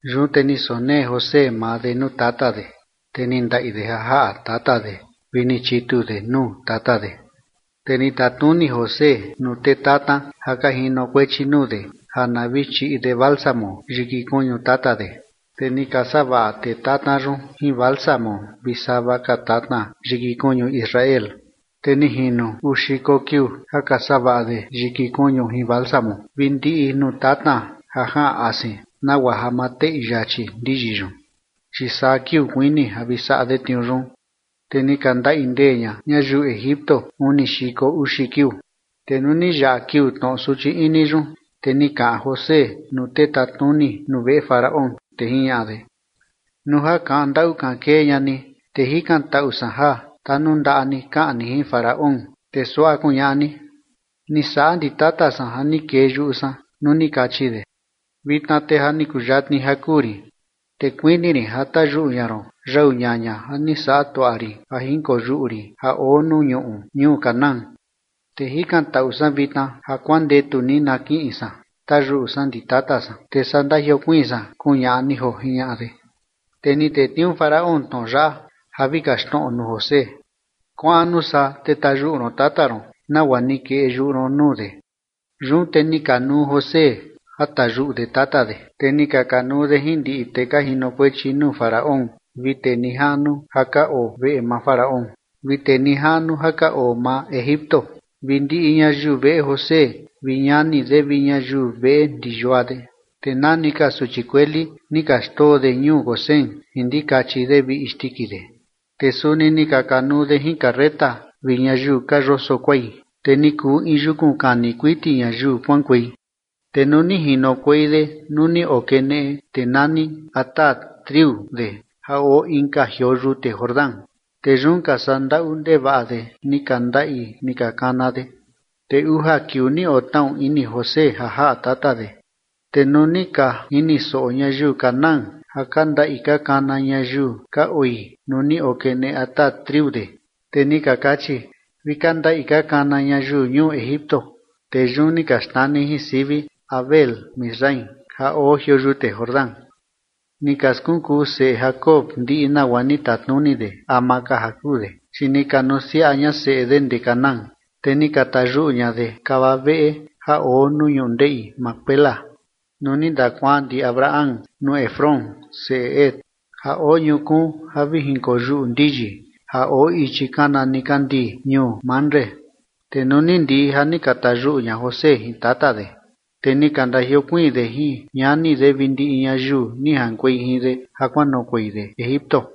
Yun te ni sonee José maa de nuu tata de, te ni ndaꞌi de ja jaꞌa tata de, vi ni chitu de nuu tata de. Te ni tatnuni José nuu tee tatna ja ka jinokuechi nuu de ja na vi chiꞌi de bálsamo yiki kuñu tata de, te ni ka savaꞌa tee tatna yun jin bálsamo vi sava ka tatna yiki kuñu Israel. Te ni jino uu xiko kiuu ja ka savaꞌa de yiki kuñu jin bálsamo vi ndiꞌi nuu tatna ja jaꞌan asin nagua ja ma teꞌi yachi ndiyi yun, chi saa kiuu kuini ja vi saꞌa de tniuu yun, te ni ka ndaꞌi ndee ña ñayiu Egipto uni xiko uxi kiuu. Te nuu ni yaꞌa kiuu tnoꞌo suchi ini yun, te ni kaꞌan José nuu tee tatnuni nuu veꞌe Faraón, te jiñaꞌa de: ―Nuu ja kaꞌan ndaꞌu kaꞌan kee ña ni, te jikantaꞌu san ja tanundaꞌa ni kaꞌan ni jin Faraón, te suaꞌa kuñaꞌa ni: “Ni saꞌa ndi tata san ja ni kee yuꞌu san nuu ni kachi de: Vitna te ja ni kuyatni ja kuu rin, te kuini rin ja tayuꞌu ña ron yau ñaña ja ni saꞌa tuaꞌa rin ja jinkoyuꞌu rin ja oo nuu ñuꞌu ñuu Canaán. Te jikantaꞌu san vitna ja kuandetu ni na kiꞌin san tayuꞌu san ndi tata san, te saa ndajiokuiin san”, kuñaꞌa ni joo ―jiñaꞌa de. Te ni tetniuu Faraón tnoꞌo yaꞌa ja vi kaxtnoꞌo nuu José: ―Kuaꞌan nuu saa te tayuꞌu ron tata ron, nagua ni kee yuꞌu ron nuu de. Yun te ni kanuu José ja tayuꞌu de tata de, te ni ka kanuu de jin ndiꞌi tee ka jinokuechi nuu Faraón vi tee nijaꞌnu ja ka oo veꞌe maa Faraón, vi tee nijaꞌnu ja ka oo maa Egipto, vi ndiꞌi ñayiu veꞌe José vi ñani de vi ñayiu veꞌe ndi yua de, te nani ka suchi kueli ni ka xndoo de ñuu Gosén jin ndikachi de vi isndiki de. Te suni ni ka kanuu de jin carreta vi ñayiu ka yoso kuai, te ni kuu in yukun kani kuiti ñayiu kuaꞌankuei. Te nuu ni jinokuei de nuu ni okeneꞌe tee nani Atad triu de ja oo inka jioo yute Jordán, te yun ka saꞌa ndaꞌu ndevaꞌa de ni ka ndaꞌi ni ka kana de, te uja kiuu ni otnaꞌu ini José ja jaꞌa tata de. Te nuu ni ka jini soꞌo ñayiu Canaán ja ka ndaꞌi ka kana ñayiu ka oi nuu ni okeneꞌe Atad triu de, te ni ka kachi: “Vi ka ndaꞌi ka kana ñayiu ñuu Egipto”. Te yun ni ka xnani jin sivi Abel-misraim ja oo jioo yute Jordán. Ni ka skunkuu seꞌe Jacob ndiꞌi nagua ni tatnuni de ama ka ja kuu de, chi ni ka nusiaꞌa ña seꞌe de ndee Canaán, te ni ka tayuꞌu ña de kava veꞌe ja oo nuu ñundeꞌi Macpela nuu ni ndakuaan ndi Abraham nuu Efrón, seꞌe Het, ja oo ñukuun ja vi kojinkoyuꞌu ndiyi ja oo ichi kana nikandii ñuu Mamre. Te nuu ni ndiꞌi ja ni ka tayuꞌu ña José jin tata de, te ni ka ndajiokuiin de jin ñani de vi ndiꞌi ñayiu ni jaꞌankuei jin de ja kuanoꞌokuei de Egipto.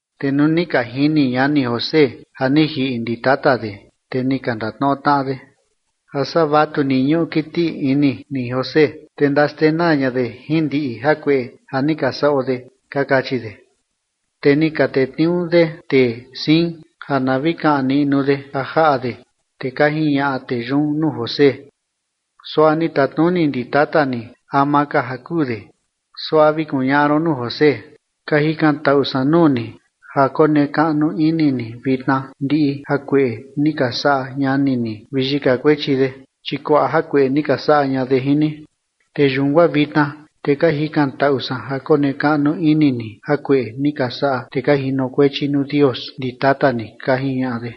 Te nuu ni ka jini ñani José ja ni jiꞌi ndi tata de, te ni ka ndatnoꞌo tnaꞌa de: ―A saa vatu ni ñuꞌu kiti ini ni José, te ndaxtenaa ña de jin ndiꞌi jakueꞌe ja ni ka saꞌo de ―ka kachi de. Te ni ka tetniuu de tee siin ja na vi kaꞌan niꞌnu de ja jaꞌa de, te ka jiñaꞌa tee yun nuu José: ―Suaꞌa ni tatnuni ndi tata ni ama ka ja kuu de. Suaꞌa vi kuñaꞌa ron nuu José: “Ka jikantaꞌu san nuu ni ja konekaꞌnu ini ni vitna ndiꞌi jakueꞌe ni ka saꞌa ñani ni vi yika kuechi de, chi kuaꞌa jakueꞌe ni ka saꞌa ña de jin ni”. Te yun guaa vitna te ka jikantaꞌu san ja konekaꞌnu ini ni jakueꞌe ni ka saꞌa tee ka jinokuechi nuu Dios ndi tata ni ―ka jiñaꞌa de.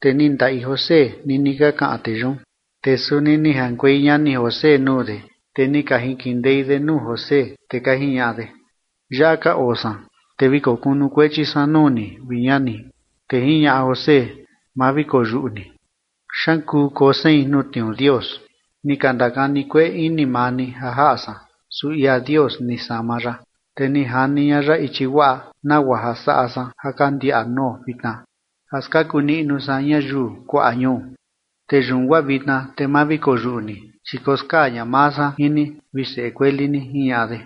Te ni ndaꞌi José nini ka kaꞌan tee yun. Te suni ni jaꞌankuei ñani José nuu de, te ni ka jinkindei de nuu José, te ka jiñaꞌa de: ―Yaꞌa ka oo san, te vi kokunukuechi san nuu ni, vi ñani. Te jiñaꞌa José: ―Ma vi koyuꞌu ni, ¿xaan kuu koo sein nuu tniuu Dios? Ni ka ndakani kueꞌe ini maa ni ja jaꞌa san, su ia Dios ni sama ya, te ni jani ña ya ichi guaꞌa, nagua ja saꞌa san ja ka ndiaꞌa nuo vitna, ja skaku niꞌnu san ñayiu kuaꞌa ñuu. Te yun guaa vitna, te ma vi koyuꞌu ni, chi koskaa ña maa san jin ni vi seꞌe kueli ni ―jiñaꞌa de.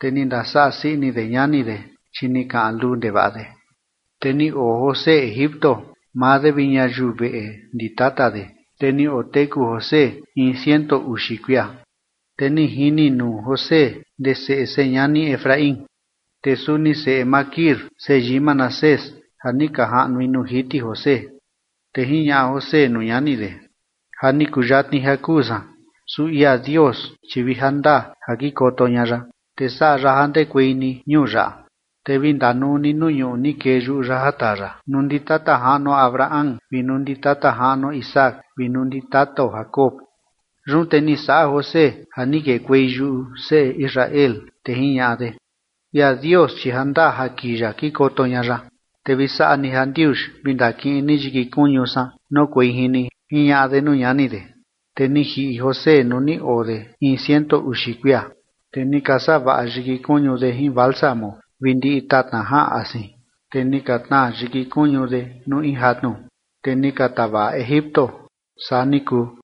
Te ni ndasaꞌa sii ini de ñani de, chi ni kaꞌan luu ndevaꞌa de. Te ni oo José Egipto, maa de vi ñayiu veꞌe ndi tata de, te ni oteku José in ciento uxi kuia. Te ni jini nuu José ndee seꞌe señani Efraín, te suni seꞌe Maquir seyii Manasés ja ni ka jaꞌnui nuu jiti José. Te jiñaꞌa José nuu ñani de: ―Ja ni kuyatni ja kuu san, su ia Dios, chi vi jandaa ja kikoto ña ya, te saꞌa ya ja ndekuei ni ñuu yaꞌa, te vi ndanuu ni nuu ñuꞌu ni kee yuꞌu ya ja taa ya nuu ndi tata jaꞌnuo Abraham vi nuu ndi tata jaꞌnuo Isaac vi nuu ndi tatao Jacob. Yun te ni saꞌa José ja ni kekuei yuꞌu seꞌe Israel, te jiñaꞌa de: ―Ia Dios chi jandaa ja kii ya kikoto ña ya, te vi saꞌa ni jandiuxi vi ndakiꞌin ni yiki kuñu san noꞌokuei jin ni ―jiñaꞌa de nuu ñani de. Te ni jiꞌi José nuu ni oo de in ciento uxi kuia, te ni ka savaꞌa yiki kuñu de jin bálsamo vi ndiꞌi tatna jaꞌan asin, te ni ka tnaa yiki kuñu de nuu in jatnu, te ni ka tavaꞌa Egipto. Saa ni kuu.